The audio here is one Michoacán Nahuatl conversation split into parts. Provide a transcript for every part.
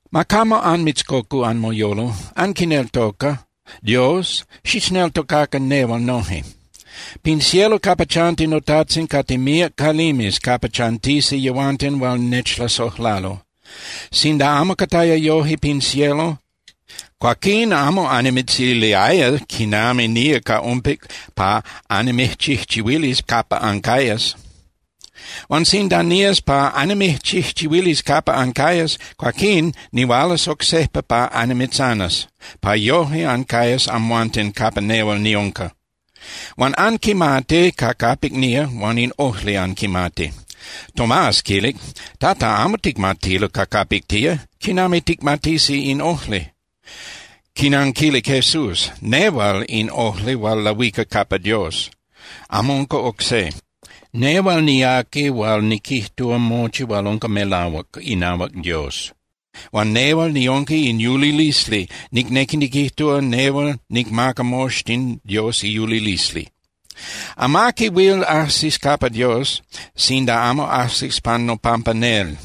’Ma camo anmitzcocu anmoyolo. Anquineltoca Dios, xichneltocacan nehual noje. Pin cielo capa chanti noTajtzin cate míac calimes capa chantisi yehuanten hual nechlasojlalo. Sinda amo cataya yoje pin cielo, cuaquín amo annimitziliaya quinami nía ca ompic pa annimijchijchihuilis capa ancayas. Huan sinda nías pa annimijchijchihuilis capa ancayas, cuaquín nihualas oc sejpa pa annimitzanas, pa yoje ancayas amhuanten capa nehual niunca. Huan anquimati ca capic nía huan in ojli anquimati. Tomás quilic: —Tata, amo ticmatilo ca capic tía. ¿Quinami ticmatisi in ojli? Quinanquilic Jesús: —Nehual in ojli hual lahuica capa Dios, amo unca oc se. Nehual niaqui hual niquijtúa mochi hual unca melahuac inahuac Dios. Huan nehual niunca in yulilisli, nicnequi niquijtúa nehual nicmaca moxtin Dios iyulilisli. Amaqui huil ajsis capa Dios sinda amo ajsis pan nopampa nel.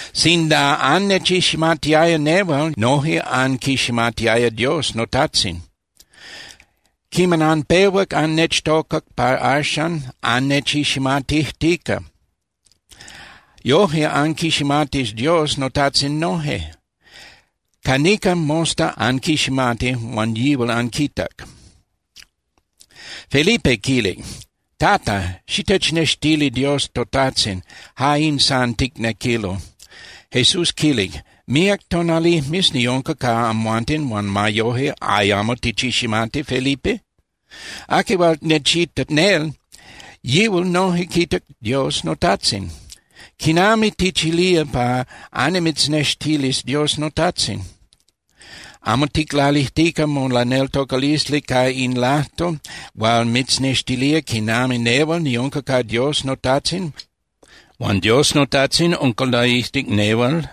Sinda annechiximatiaya nehual, noje anquiximatiaya Dios noTajtzin. Quiman anpehuac annechtocac pa axan, annechiximatijtica. Yoje anquiximatis Dios noTajtzin noje. Ca nican mosta anquiximati huan yihual anquitac. Felipe quilic: —Tata, xitechnextili Dios toTajtzin, ja in san ticnequilo. Jesús quilic: —Míac tonalijmes niunca ca amhuanten huan ma yoje ¿ayamo tichiximati, Felipe? Aqui hual nechitac nel, yihual noje quitac Dios noTajtzin. ¿Quinami tichilía pa annimitznextilis Dios noTajtzin? ¿Amo ticlalijtica molaneltocalisli ca in lajtol hual mitznextilía quinami nehual niunca ca Dios noTajtzin huan Dios noTajtzin unca laijtic nehual?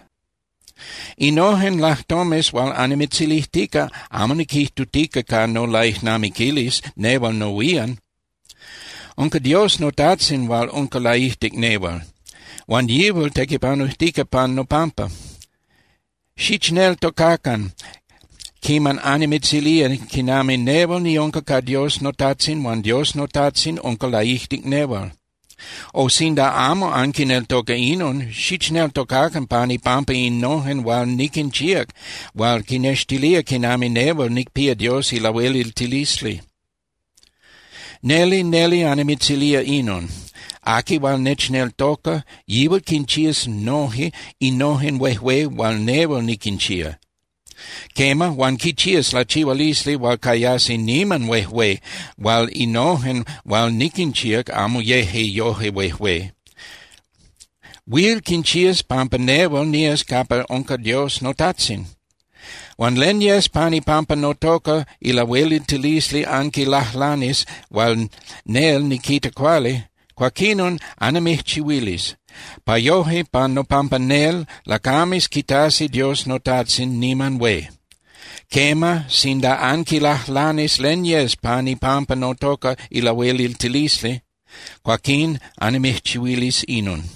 Innojen lajtomes hual annimitzilijtica amo niquijtutica ca nolaijnamiquilis nehual nohuían. Unca Dios noTajtzin hual unca laijtic nehual, huan yihual tequipanujtica pan nopampa. Xichneltocacan quiman annimitzilía quinami nehual niunca ca Dios noTajtzin huan Dios noTajtzin unca laijtic nehual. O, sinda amo anquineltoca inon, xichneltocacan pan ipampa innojen hual niquinchíac hual quinextiliaya quinami nehual nicpía Dios ilahueliltilisli. Neli, neli annimitzilía inon: Aqui hual nechneltoca, yihual quinchías noje innojen huejué hual nehual niquinchía. Quema, huan quinchías lachihualisli hual cayasi niman huejué hual innojen hual niquinchíac amo yeje yoje huejué. Huil quinchías pampa nehual nías capa unca Dios noTajtzin. Huan len yes pan ipampa notoca ilahueliltilisli anquilajlanis hual nel niquita cuali, cuaquinon annimijchihuilis, pa yoje pan nopampa nel lacames quitasi Dios noTajtzin niman hué. Quema, sinda anquilajlanis len yes pan ipampa notoca ilahueliltilisli, cuaquín annimijchihuilis inon.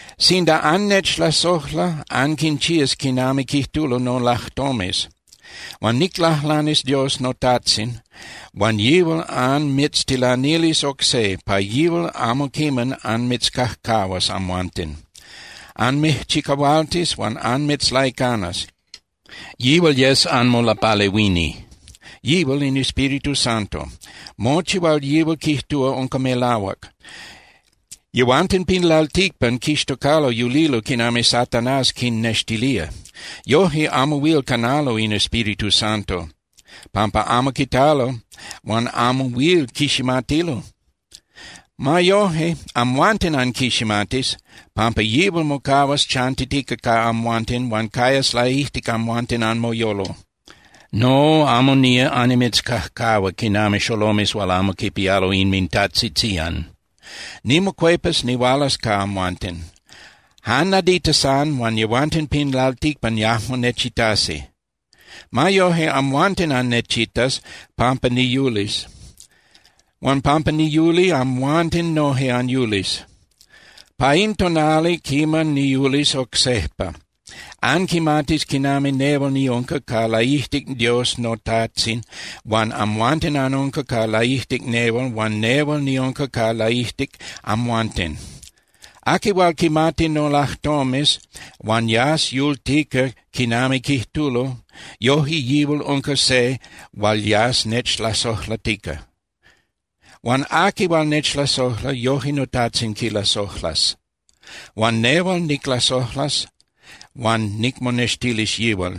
’Sinda annechlasojla, anquinchías quinami quijtulo nolajtomes. Huan niclajlanis Dios noTajtzin huan yihual anmitztilanilis oc se, pa yihual amo quiman anmitzcajcahuas amhuanten. Anmijchicahualtis huan anmitzlaicanas, yihual yes anmolapalehuini. Yihual in Espíritu Santo. Mochi hual yihual quijtúa unca melahuac. Yehuanten pin lalticpan quixtocalo yulilo quinami Satanás quinnextilía. Yoje amo huil canalo in Espíritu Santo, pampa amo quitalo huan amo huil quiximatilo. Ma yoje, amhuanten anquiximatis, pampa yihual mocahuas chantitica ca amhuanten huan cayas laijtic amhuanten anmoyolo. No, amo nía annimitzcajcahua quinami xolomes hual amo quipialo inmintajtzitzían. Nimocuepas nihualas ca amhuanten. Jan nadita san huan yehuanten pin lalticpan yajmo nechitasi. Ma yoje, amhuanten annechitas pampa niyulis. Huan pampa niyuli, amhuanten noje anyulis. Pa in tonali quiman niyulis oc sejpa, anquimatis quinami nehual niunca ca laijtic Dios noTajtzin huan amhuanten anunca ca laijtic nehual huan nehual niunca ca laijtic amhuanten. Aqui hual quimati nolajtomes huan yas yultica quinami quijtulo, yoje yihual unca se hual yas nechlasojlatica. Huan aqui hual nechlasojla, yoje noTajtzin quilasojlas, huan nehual niclasojlas huan nicmonextilis yihual.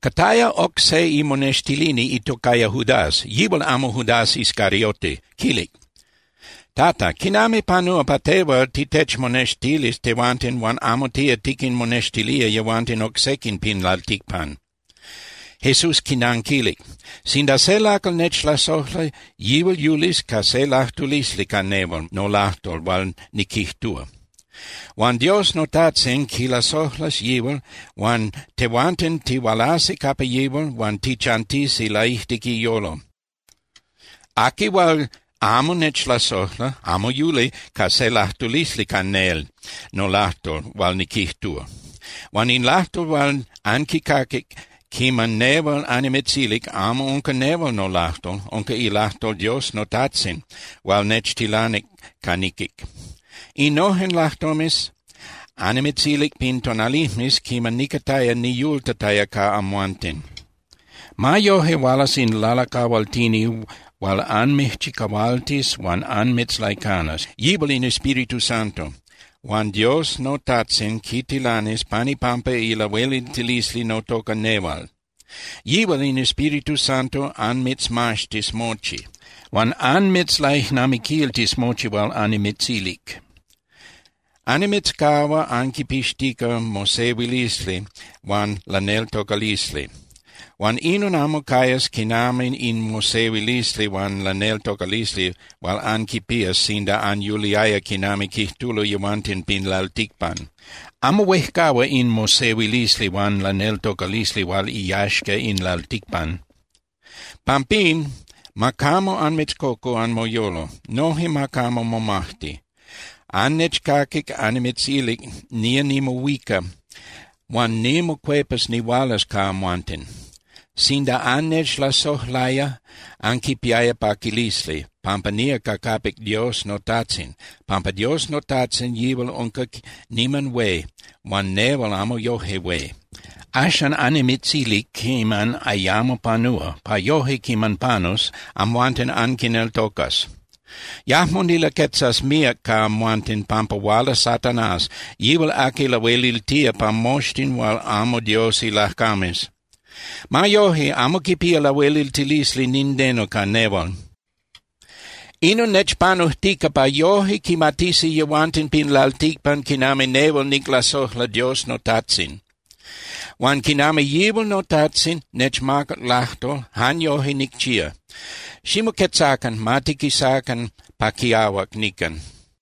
Cataya oc se imonextilini itocaya Judas, yihual amo Judas Iscariote, quilic: —Tata, ¿quinami panúa pa tehual titechmonextilis tehuanten huan amo tía tiquinmonextilía yehuanten oc sequin pin lalticpan? Jesús quinanquilic: —Sinda se lacal nechlasojla, yihual yulis ca se lajtulisli ca nehual nolajtol hual niquijtúa. Huan Dios noTajtzin quilasojlas yihual huan tehuanten tihualasi capa yihual huan tichantisi laijtic iyolo. Aqui hual amo nechlasojla amo yuli ca se lajtulisli ca nel nolajtol hual niquijtúa. Huan in lajtol hual anquicaquic quiman nehual annimitzilic amo unca nehual nolajtol. Unca ilajtol Dios noTajtzin hual nechtilanic ca niquic. Innojen lajtomes annimitzilic pin tonalijmes quiman nicataya niyultataya ca amhuanten. Ma yoje, hualas in Lalacahualtini hual anmijchicahualtis huan anmitzlaicanas, yihual in Espíritu Santo. Huan Dios noTajtzin quitilanis pan ipampa ilahueliltilisli notoca nehual. Yihual in Espíritu Santo anmitzmaxtis mochi, huan anmitzlaijnamiquiltis mochi hual annimitzilic. Annimitzcahua anquinpixtica mosehuilisli huan laneltocalisli, huan inon amo cayas quinami in mosehuilisli huan laneltocalisli hual anquinpías sinda anyuliaya quinami quijtulo yehuanten pin lalticpan. Amo huejcahua in mosehuilisli huan laneltocalisli hual iyaxca in lalticpan. Pampín, ma camo anmitzcocu anmoyolo, noje ma camo momajti. Annechcaquic annimitzilic nía nimohuica huan nimocuepas nihualas ca amhuanten. Sinda annechlasojlaya, anquipiaya paquilisli, pampa nía ca capic Dios noTajtzin, pampa Dios noTajtzin yihual unca niman hué huan nehual amo yoje hué. Axan annimitzilic quiman ayamo panúa, pa yoje quiman panus, amhuanten anquineltocas. Yajmo nilaquetzas míac ca amhuanten, pampa huala Satanás, yihual aqui lahueliltía pa moxtin hual amo Dios ilacames. Ma yoje, amo quipía lahueliltilisli nindeno ca nehual. Inon nechpanujtica pa yoje quimatisi yehuanten pin lalticpan quinami nehual niclasojla Dios noTajtzin. Huan quinami yihual noTajtzin nechmacac lajtol, jan yoje nicchía. Ximoquetzacan, ma tiquisacan pa quiahuac nican.